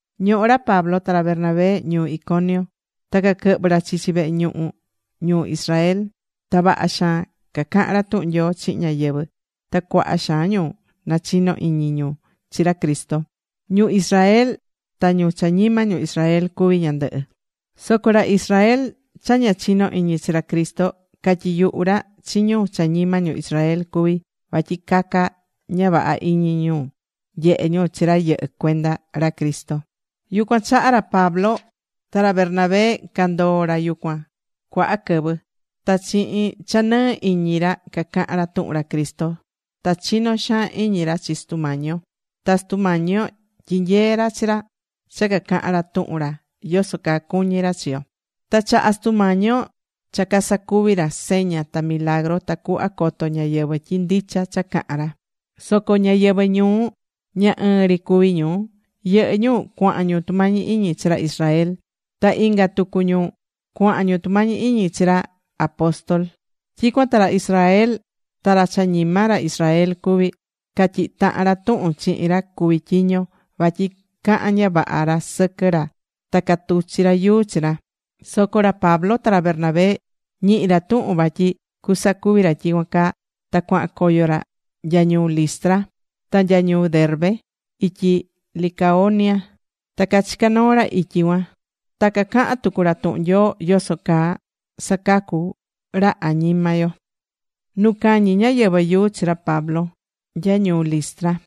Ñohó ra Pablo ta ra Bernabé ñuu Iconio. Ta caquɨhvɨ̱ ra chichi vehe ñuhu ñu Israel. Ta vaha xaan cacaha̱n ra tuhun Nyoo chihin ñáyɨvɨ. Ta cuaha xaan ñu nachino iñi ñu chi ra Cristo, ñu Israel ta ñu cha ñima ñu Israel cuví ñandɨhɨ. Soco ra Israel cha ña chinó iñi chi ra Cristo catyiyuhu̱ ra chi ñu cha ñima ñu Israel cuví vatyi caca ña vaha iñi ñu nyehe ñu chi ra yɨhɨ́ cuenda ra Cristo. Yucuan chaha ra Pablo ta ra Bernabé candoo̱ ra yucuan cuaha quɨvɨ. Ta chihin cha nɨɨ iñi ra cacahán ra tuhun ra Cristo. Ta chinó xaan iñi ra chi Sutu Mañi yo. Ta Sutu Mañi yo tyinyee̱ ra chi ra cha cacahán ra tuhun ra yoso caa cuñí ra chi yo. Ta chaha̱ Sutu Mañi yo cha casacuvi ra seña ta milagru tacuhva coto ñáyɨvɨ tyi ndicha cha cahan ra. Soco ñáyɨvɨ ñuu, ña ɨɨn ri cuví ñu. Yɨhɨ́ ñu cuahan ñu tumañi iñi chi ra Israel. Ta inga tucu ñu cuahan ñu tumañi iñi chi ra apóstol. Tyicuan ta ra Israel ta ra cha ñima ra Israel cuví, catyihi̱ tahan ra tuhun chihin ra cuví tyiño, vatyi cahan ña vaha ra sɨquɨ ra, ta catuchi̱ ra yuu chi ra. Soco ra Pablo ta ra Bernabé ñihi̱ ra tuhun vatyi cusacuvi ra tyicuan caa, ta cuahan coyo ra nya ñuu Listra, ta nya ñuu Derbe ityi Licaonia. Ta cachica̱ noo ra ityi cuan. Ta cacaha̱n tucu ra tuhun Nyoo yoso caa sacacu ra añima yo.Nu cañi ñáyɨvɨ yuu chi ra Pablo nya ñuu Listra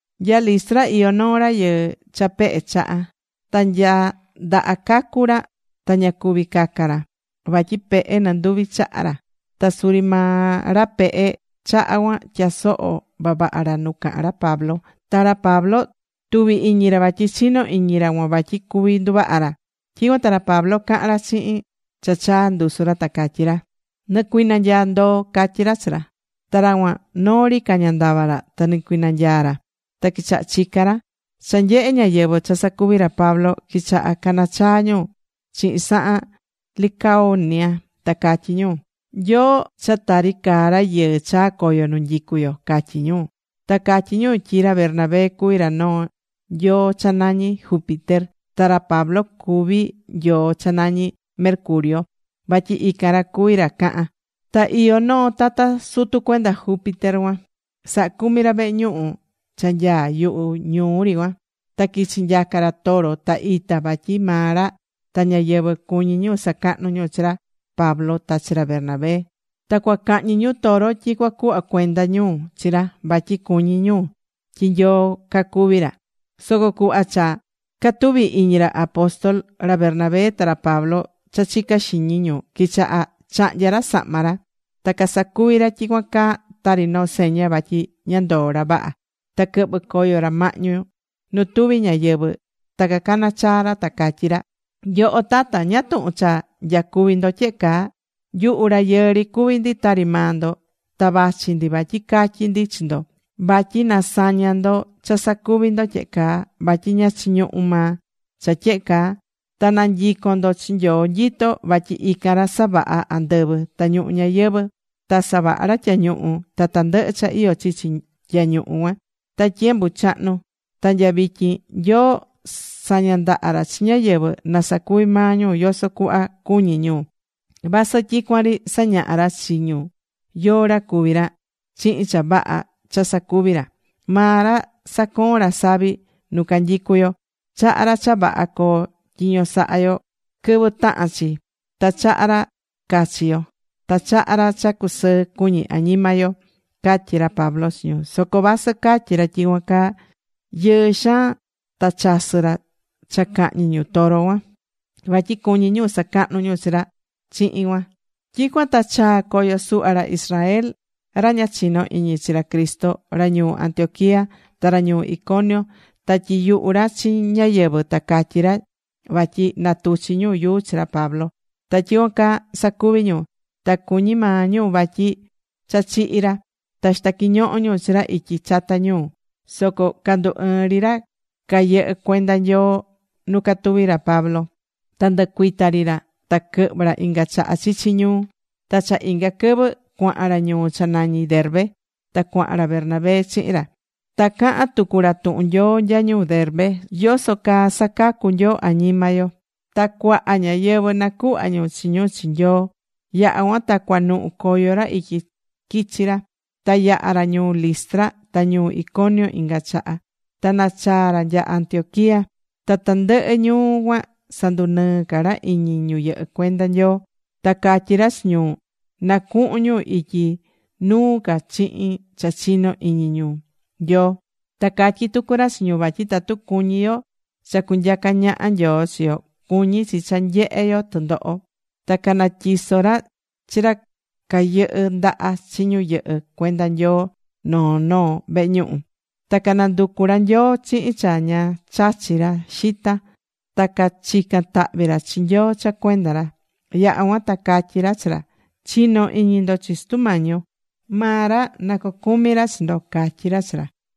Nya Listra iyó noo rayɨɨ cha pehe chaha. Ta nya ndaha cacu̱ ra ta ña cuví caca ra. Vatyi pehe nɨnduvi chaha ra. Ta suri maa ra pehe chaha cuan tyasoho̱ vavaha ra nu cahán ra Pablo. Ta ra Pablo, tuvi̱ iñi ra vatyi chinó iñi ra cuan vatyi cuví nduvaha ra. Tyicuan ta ra Pablo cahan ra chihin cha chaa ndusu ra, ta catyí ra: ―Nɨ̱cuinanyaa ndoo ―catyí ra Pablo chi ra. Ta ra cuan, noo ri caña ndava ra, ta nɨcuinanyaa̱ ra. Ta quichaha̱ chica ra. Cha nyehé ñáyɨvɨ cha sacuvi̱ ra Pablo, quichaha cana chaa ñu chihin sahan Licaonia, ta catyí ñu: ―Nyoo cha tari caá rayɨɨ chaa̱ coyo nu nyicú yo ―catyí ñu. Ta catyí ñu tyi ra Bernabé cuví ra noo nyoo cha nañí Júpiter, ta ra Pablo cuví nyoo cha nañí Mercurio, vatyi ican ra cuví ra cahán. Ta iyó noo tata sutu cuenda Júpiter cuan, saha cumí ra vehe ñuhu cha nyaá yuhu ñuu ri cuan. Ta quichi̱ nyaca ra toro ta ita vatyi maa ra ta ñáyɨvɨ cuñí ñu sacahnu ñu chi ra Pablo ta chi ra Bernabé. Ta cuacahñi ñu toro tyi cuacuhva cuenda ñu chi ra, vatyi cuñí ñu tyi nyoo cacuví ra. Soco cuhva cha catuvi̱ iñi ra apóstol, ra Bernabé ta ra Pablo, cha chicá xiñi ñu, quichaha̱ chahnya̱ ra sahma ra. Ta casacuví ra tyicuan caa tari noo seña vatyi ña ndoó ra vaha. Ta quɨhvɨ̱ coyo ra mahñu nu tuvi ñáyɨvɨ, ta cacana̱ chaa ra, ta catyí ra: ―Nyoho tata, ¿ñáá tuhun cha nyacuví ndo tyehe caa? Nyuhu rayɨɨ ri cuví ndi tari maa ndo. Ta vachi ndi vatyi catyi ndi chi ndo vatyi na saña ndo cha sacuvi ndo tyehe caa. Vatyi ña chiñuhu maa cha tyehe caa. Ta na cunyicon ndo chi Nyoo nyitó. Vatyi ican ra savaha̱ andɨvɨ ta ñuhu ñayɨvɨ̱. Ta savaha̱ ra tyañuhu ta tandɨhɨ cha iyó chichi tyañuhu cuan. Ta tyiembu chahnu ta nya vityin, Nyoo saña̱ ndaha ra chi ñáyɨvɨ na sacuvi maa ñu yoso cuhva cuñí ñu, vasɨ tyicuan ri sañahá ra chi ñu yóó ra cuví ra, chihin cha vaha cha sacuví ra. Maa ra sacoón ra savi nu canyicú yo. Chahá ra cha vaha coo tyiño saha yo quɨvɨ tahan chi. Ta chahá ra cachi yo. Ta chahá ra cha cusɨɨ cuñí añima yo ―catyí ra Pablo chi ñu. Soco vasɨ catyí ra tyicuan caa, yɨɨ xaan ta chasɨ ra cha cahñi ñu toro cuan, vatyi cuñí ñu sacahnu ñu chi ra chihin cuan. Tyicuan ta chaa̱ coyo suhva ra Israel, ra ña chinó iñi chi ra Cristo, ra ñuu Antioquía, ta ra ñuu Iconio. Ta tyiyuhu̱ ra chi ñáyɨvɨ, ta catyí ra vatyi na tuchi ñu yuu chi ra Pablo. Ta tyicuan caa sacuvi̱ ñu. Ta cuñi̱ maa ñu vatyi cha chihi̱ ra. Ta xita̱ quiñoho ñu chi ra ityi chata ñuu. Soco candu ɨɨ̱n ri ra cayɨhɨ́ cuenda Nyoo nu catuví ra Pablo. Ta ndɨcuita̱ ri ra. Ta quɨhvɨ̱ ra inga chaha chichi ñuu. Ta cha inga quɨvɨ cuahan ra ñuu cha nañí Derbe ta cuahan ra Bernabé chihin ra. Ta caha̱n tucu ra tuhun Nyoo nya ñuu Derbe yoso caa sacacu Nyoo añima yo. Ta cuaha ñáyɨvɨ nacuhva̱ ñu chi ñu chi Nyoo. Yaha̱ cuan ta cuanuhu coyo ra ityi quichi ra. Ta yaha̱ ra ñuu Listra ta ñuu Iconio inga chaha, ta nachaa̱ ra nya Antioquía. Ta tandɨhɨ ñuu cuan sandunɨɨ ca ra iñi ñu yɨhɨ́ cuenda Nyoo. Ta catyí ra chi ñu na cuhun ñu ityi nuu ca chihin cha chino iñi ñu Nyoo. Ta catyí tucu ra chi ñu vatyi tatu cuñí yo cha cunyacá ñaha Nyoo chi yo, cuñí chi cha nyehe yo tɨndoho. Ta canatyiso̱ ra chi ra ca quɨhɨ ndaha chi ñu yɨhɨ́ cuenda Nyoo noo noo vehe ñuhu. Ta cananducu ra Nyoo chihin cha ña chachí ra xita ta cachican tahvi ra chi Nyoo cha cuenda ra. Yaha̱ cuan ta catyí ra chi ra: ―Chi̱no iñi ndo chi Sutu Mañi yo. Maa ra na cocumi ra chi ndo ―catyi ra chi ra.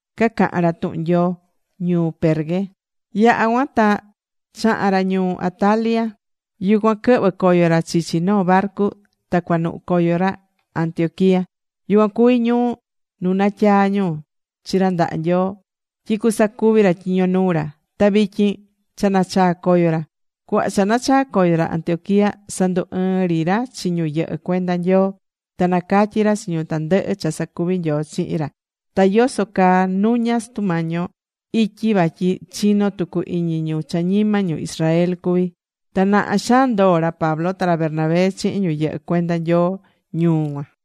Cacaha̱n ra tuhun Nyoo ñuu Perge. Yaha̱ cuan ta chaha̱n ra ñuu Atalia. Yucuan quɨhvɨ̱ coyo ra chichi noo barcu ta cuanuhu coyo ra Antioquía. Yucuan cuví ñuu nu natyaa̱ ñu chi ra ndaha Nyoo tyi cusacuvi ra tyiño nuu ra, ta vityin cha nachaa̱ coyo ra. Cuhva cha nachaa̱ coyo ra Antioquía sandu ɨɨ̱n ri ra chi ñu yɨhɨ́ cuenda Nyoo. Ta nacatyi̱ ra chi ñu tandɨhɨ cha sacuvi̱ Nyoo chihin ra. Ta yoso caa nuña̱ Sutu Mañi yo ityi vatyi chinó tucu iñi ñu cha ñima ñu Israel cuví. Ta naha xaan ndoo̱ ra Pablo ta ra Bernabé chihin ñu yɨhɨ́ cuenda Nyoo ñuu cuan.